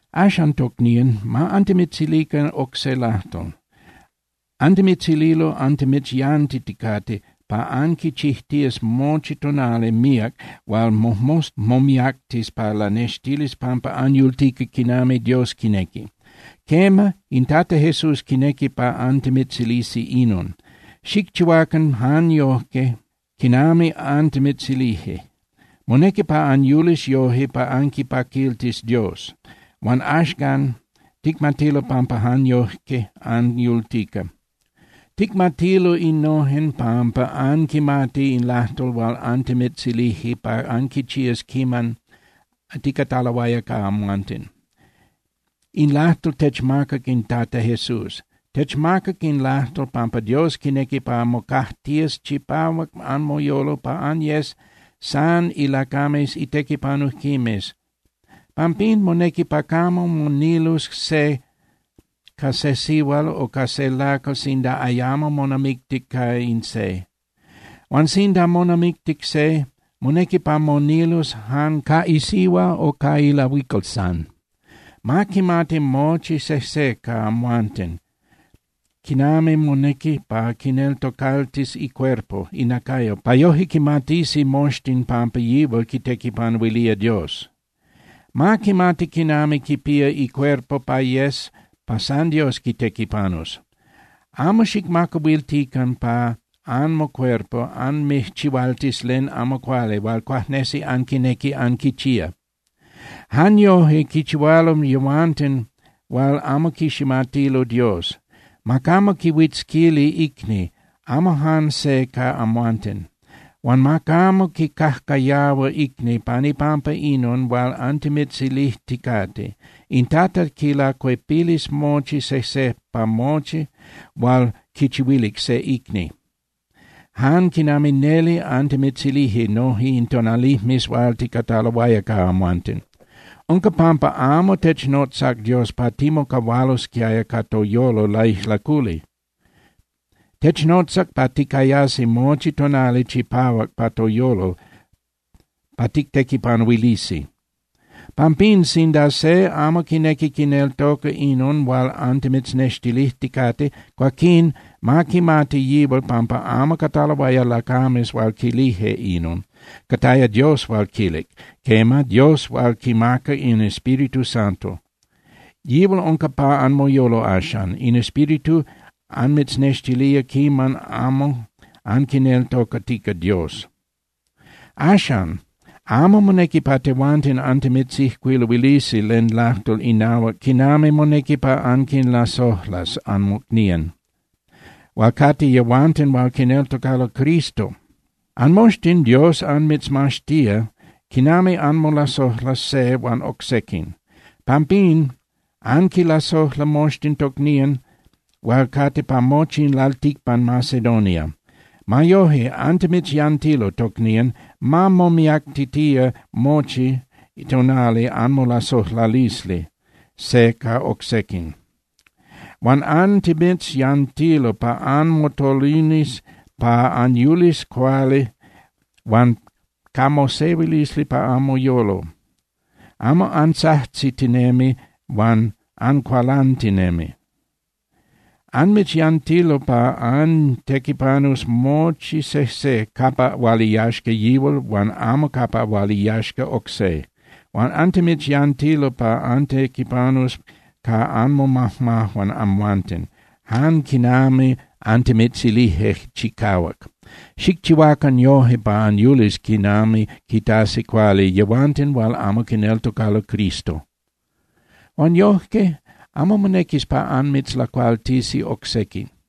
Axan, tocnían, ma antimitzilican oc se lajtol. Antimitzililo antimitzyantiticate pa anquichijtías mochi tonali míac hual mojmosta momiactis pa lanextilis pampa anyultica quinami Dios quinequi. Quema, in Tata Jesús quinequi pa antimitzilisi inon. Xicchihuacan jan yoje quinami antimitzilije. Monequi pa anyulis yoje pa anquipaquiltis Dios, huan axcan ticmatilo pampa jan yoje anyultica. Ticmatilo inon pampa anquimati in lajtol hual antimitzilije pa anquichías quiman ticataloaya ca amhuanten. In lajtol techmacac in Tata Jesús. Techmacac in lajtol pampa Dios quinequi pa mocajtías chipahuac anmoyolo pa anyes san ilacames itequipanujquimes. Pampín monequi pa camo monilus se ca se sihual o ca se lacal sinda ayamo monamictic ca in se. Huan sinda monamictic se, monequi pa monilus jan ca isihua o ca ilahuical san. Ma quimati mochi sejse ca amhuanten quinami monequi pa quineltocaltis icuerpo (inacayo) pa yoje quimatisi moxtin pampa yihual quitequipanuilía Dios. Ma quimati quinami quipía icuerpo pa yes pa san Dios quitequipanus. Amo xicmacahuiltican pa anmocuerpo anmijchihualtis len amo cuali hual cuajnesi anquinequi anquichía. Jan yoje quichihualo yehuanten hual amo quiximatilo Dios. Ma camo quihuitzquili icni, amo jan se ca amhuanten. Huan ma camo quicajcayahua icni pan ipampa inon hual antimitzilijticate. In Tata quilacuepilis mochi sejse pa mochi hual quichihuilic se icni, jan quinami neli antimitzilije noje in tonalijmes hual ticataloaya ca amhuanten. Unca pampa amo technotzac Dios pa timocahualosquiaya ca toyolo laijlaculi. Technotzac pa ticayasi mochi tonali chipahuac pa toyolo pa tictequipanuilisi. Pampín, sinda se amo quinequi quineltoca inon hual antimitznextilijticate, cuaquín ma quimati yihual pampa amo cataloaya lacames hual quilije inon. Cataya Dios hual quilic, quema, Dios hual quimaca in Espíritu Santo. Yihual unca pa anmoyolo axan. In Espíritu anmitznextilía quiman amo anquineltocatica Dios. Axan, amo monequi pa tehuanten antimitzijcuiluilisi len lajtol inahuac quinami monequi pa anquinlasojlas anmocnían, hual cate yehuanten hual quineltocalo Cristo. Anmoxtin Dios anmitzmaxtía quinami anmolasojlas se huan oc sequin. Pampín, anquinlasojla moxtin tocnían hual cate pa mochi in lalticpan Macedonia. Ma yoje, antimitzyantilo, tocnían, ma momiactitía mochi tonali anmolasojlalisli se ca oc sequin. Huan antimitzyantilo pa anmotolinis pa anyulis cuali huan ca mosehuilisli pa anmoyolo, amo antzajtzitinemi huan ancualantinemi. Antimitzyantilo pa antequipanus mochi sejse capa hual iyaxca yihual huan amo capa hual iyaxca oc se. Huan antimitzyantilo pa antequipanus ca anmomajmajuan amhuanten, jan quinami antimitzilije chicahuac. Xicchihuacan yojque pa anyulis quinami quitasi cuali yehuanten hual amo quineltocalo Cristo. Huan yojque amo monequis pa anmitzlacualtisi oc sequin.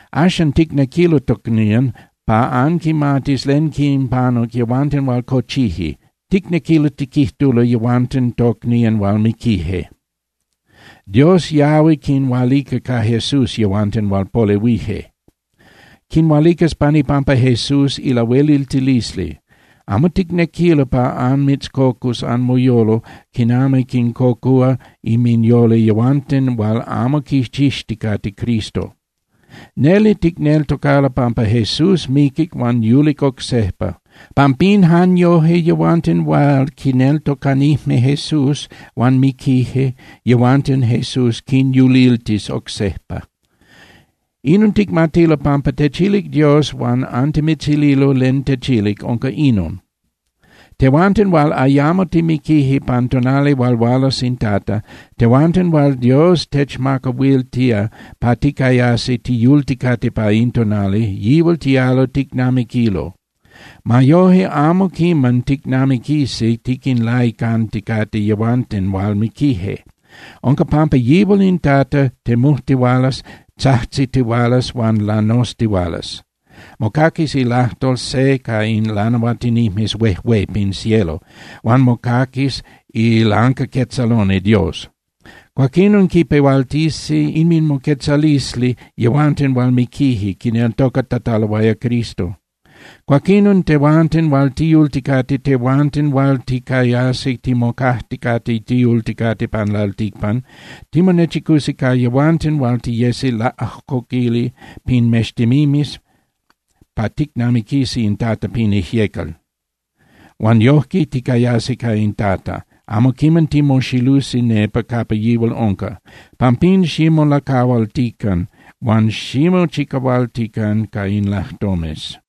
Axan ticnequilo, tocnían, pa anquimatis len quinpanuc yehuanten hual cochije, ticnequilo tiquijtulo yehuanten tocnían hual miquije. Dios yahui quinhualica ca Jesús yehuanten hual polehuije. Quinhualicas pan ipampa Jesús ilahueliltilisli. Amo ticnequilo pa anmitzcocus anmoyolo quinami quincocúa inminyolo yehuanten hual amo quichixticate Cristo. Neli ticneltocalo pampa Jesús miquic huan yulic oc sejpa. Pampín, jan yoje yehuanten hual quineltocanijme Jesús huan miquije, yehuanten Jesús quinyuliltis oc sejpa. Inon ticmatilo pampa techilic Dios huan antimitzililo len techilic, unca inon: Tehuanten hual ayamo timiquije pan tonali hual hualas in Tata, tehuanten hual Dios techmacahuiltía pa ticayasi tiyulticate pa in tonali, yihual tialo ticnamiquilo. Ma yoje amo quiman ticnamiquisi tiquinlaicanticate yehuanten hual miquije. Unca pampa yihual in Tata temujtihualas, tzajtzitihualas huan lanoztihualas. Mocaquis ilajtol se ca in lanahuatinijmes huejué pin cielo, huan mocaquis ilancaquetzaloni Dios. Cuaquinon quipehualtisi inminmoquetzalisli yehuanten hual miquije quineltocatataloaya Cristo. Cuaquinon, tehuanten hual tiyulticate, tehuanten hual ticayasi timocajticate tiyulticate pan lalticpan, timonechicusi ca yehuanten huan tiyesi laꞌajcoquili pin mextemimes pa ticnamiquisi in Tata pin ijyecal. Huan yojque ticayasi ca in Tata, amo quiman timoxilusi nepa capa yihual unca. Pampín, ximolacahualtican huan ximochicahualtican ca in lajtomes.